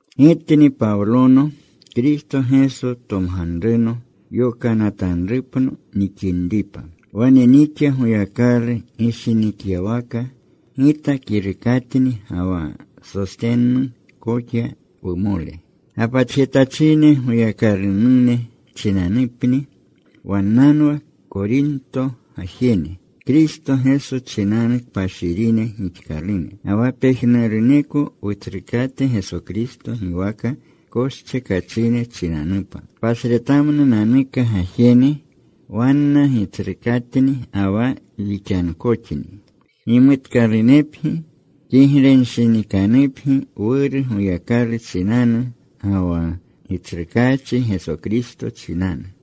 Gitni Pawlono, Kristo Geso tomganruno yokanatanrupno nixinripa. Wane nixa Goyakalu gishinikyawaka. Gita kirukatni ga wa Sostennu koxa, wumole. Gapatjetachine Goyakalunune chinanupni. Wannanwa Korinto gajene, Kristo Geso chinanu kpashirine gixkalune. Ga wa pejnuruneko Wutsrukate Geso Kristo giwaka koschekachine chinanupa, pasretamnunanuka gajene. Wanna Gitsrukatni ga wa wixankoxni. Gimutkalunepgi. Kiglenshinikanupgi Wuru Goyakalu chinanu, ga wa Gitsrukaachi Geso Kristo chinanu.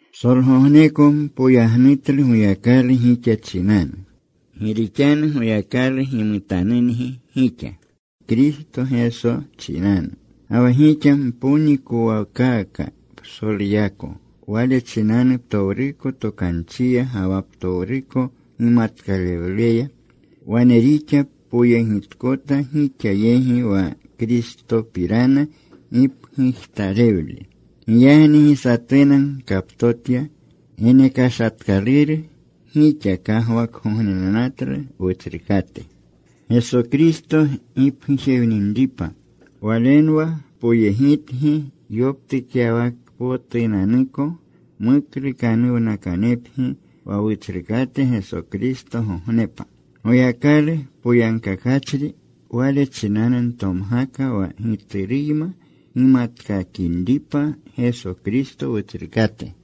Psolgogneko npoyagnutlu Goyakalu gixa chinanu, gi rixanu Goyakalu gimutanungi gixa Kristo Geso chinanu. Ga wa gixa mponikowkaaka psoluyako Wale chinanu, ptowruko tokanchiya ga wa ptowruko gimatkalewluya. Wane rixa poyegitkota gixa yegi wa Kristopirana gipgujtalewlu. Giyagni gi satuna gkaptotya genekashatkaluru. Gixa kagwakgognenatlu Wutsrukate Geso Kristo gipgujewninripa. Walenwa poyegitangi yoptukyawakpotunanuko, muklukanuwnakanepgi wa Wutsrukate Geso Kristogognepa. Goyakalu poyagkakachri. Wale chinanu ntomgaka wa Gituruyma gimatkakinripa, Geso Kristo Wutsrukate.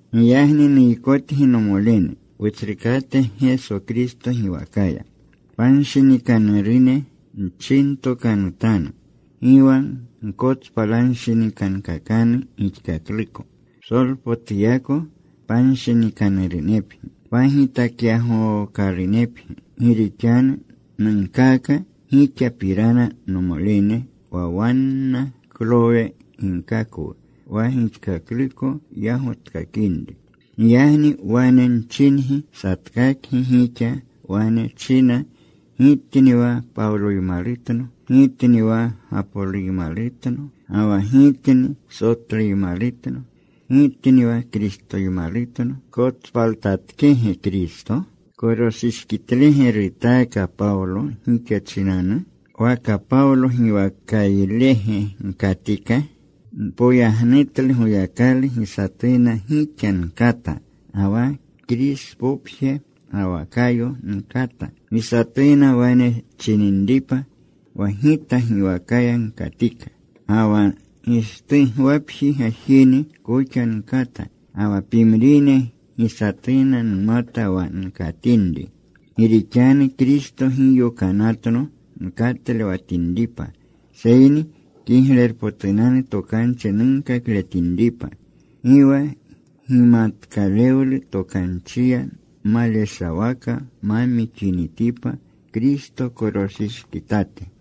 Giyagni nuykotgi, nomolene, Wutsrukate Geso Kristo giwakaya, panshinikanurune nchintokanutanu. Gi wa gkotspalanshinikankakanu gixkakluko. Psolpotuyako panshinikanurunepgi. Pagitakyagookalunepgi. Gi rixanu nunkaaka gixapirana, nomolene, wa wanna Klowe ginkakwu wa gixkakluko yagotkakinri. Giyagni wane nchingi, satkakgi gixa wane china, “Gitni wa Pawloymalutno.” “Gitni wa Gapoloymalutno.” Ga wa “Gitni Sotluymalutno.” “Gitni wa Kristoymalutno.” ¿Kotspaltatkege Kristo? ¿Koroshishkitlege rutaaka Pawlo gixa chinanu? ¿Waka Pawlo giwakaylege gkatika? Npoyagnutlu Goyakalu gi satuna gixa nkata, ga wa Krispopje ga wa Kayo nkata, gi satuna wane chininripa wa gita giwaka gkatika. Ga wa Gishtugwapji gajene koxa nkata. Ga wa pimrine gi satuna numata wa nkatinri. Gi rixanu Kristo gi yokanatno nkatlewatinripa, seyni Kiglerpotunanu Tokanchi nunkakletinripa, gi wa gimatkalewlu tokanchiya maleshawaka ma mixinitipa Kristo koroshishkitate.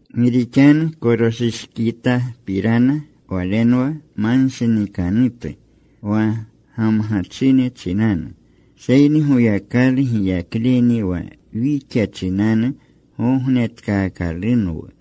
Gi rixanu koroshishkitapirana walenwa manshinikanutu wa gamgachine chinanu. Seyni Goyakalu giyakleni wa wixa chinanu gognetkaakalunwu.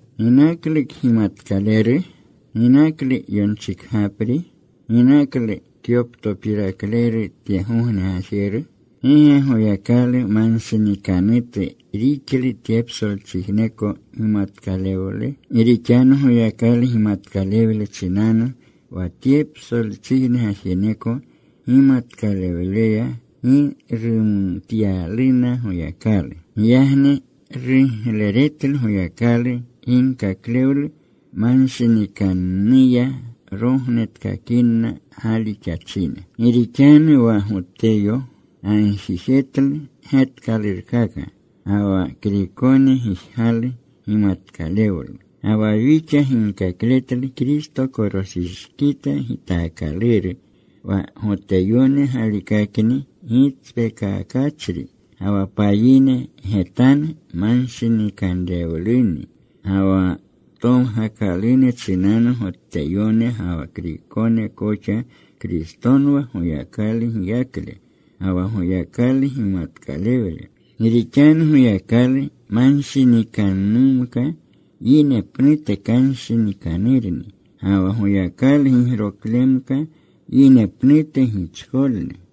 ¿Ginaklu kgimatkaleru? ¿Ginaklu yonchikgapri? ¿Ginaklu kyoptopirakleru tyegogne gajeru? ¿Gi ge Goyakalu manshinikanutu rixlu tye psolchijneko gimatkalewle? Gi rixanu Goyakalu gimatkalewle chinanu wa tye psolchijne gajeneko gimatkalewleya gi rumatyaluna Goyakalu. Giyagni rugleretlu Goyakalu, ginkaklewlu manshinikannuya rognetkakinni galixachine. Gi rixanu wa Goteyone gagjijetlu getkalurkaka. Ga wa Kriykone gijgalu gimatkalewlu. Ga wa wixa ginkakletlu Kristo koroshishkita gitaakaluru, wa Goteyone galikakni gitspeekakachri, ga wa payine getanu manshinikanrewluni. Ga wa tomgakalune chinanu, Goteyone ga wa Kriykone koxa, Kristonwa Goyakalu giyakle ga wa Goyakalu gimatkalewle. Gi rixanu Goyakalu manshinikannumka yine pnute kanshinikanurni. Ga wa Goyakalu gigroklemka yine pnute gichkolni.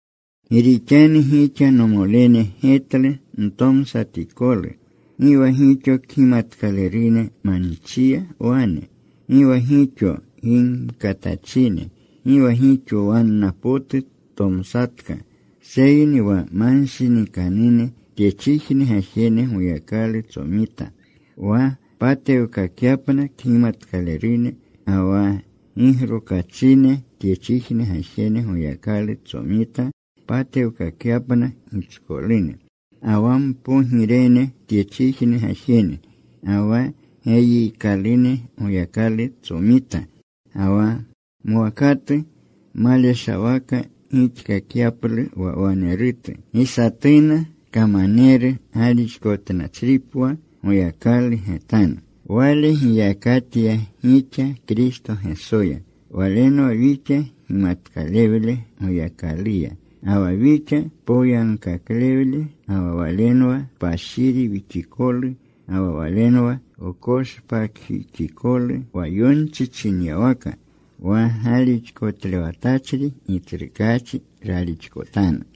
Gi rixanu gixa, nomolene, getlu ntomsatikolu. Gi wa gixo kgimatkalerune manchiya wane, gi wa gixo gimkatachine, gi wa gixo wanna potu tomsatka. Seyni wa manshinikanune tyechijne gajene Goyakalu tsomita wa patewkakyapna kgimatkalerune. Ga wa gigrokachine tyechijne gajene Goyakalu tsomita patewkakyapna gichkolune. Ga wa mpogirene tyechijne gajene, ga wa geyiikalune Goyakalu tsomita, ga wa mwakatu, maleshawaka rixkakyaplu wa wanerutu, gi satuna kamaneru galixkotnachripwa Goyakalu getanu. Wale giyakatya gixa Kristo Gesoya. Walenwa wixa gimatkalewle Goyakaluya, ga wa wixa poyagkaklewle, ga wa Walenwa kpashiri wixikolu ga wa Walenwa wkoshpakjixikolu, wa yonchi chinyawaka: Wa galixkotlewatachri Gitsrukaachi ralixkotanu.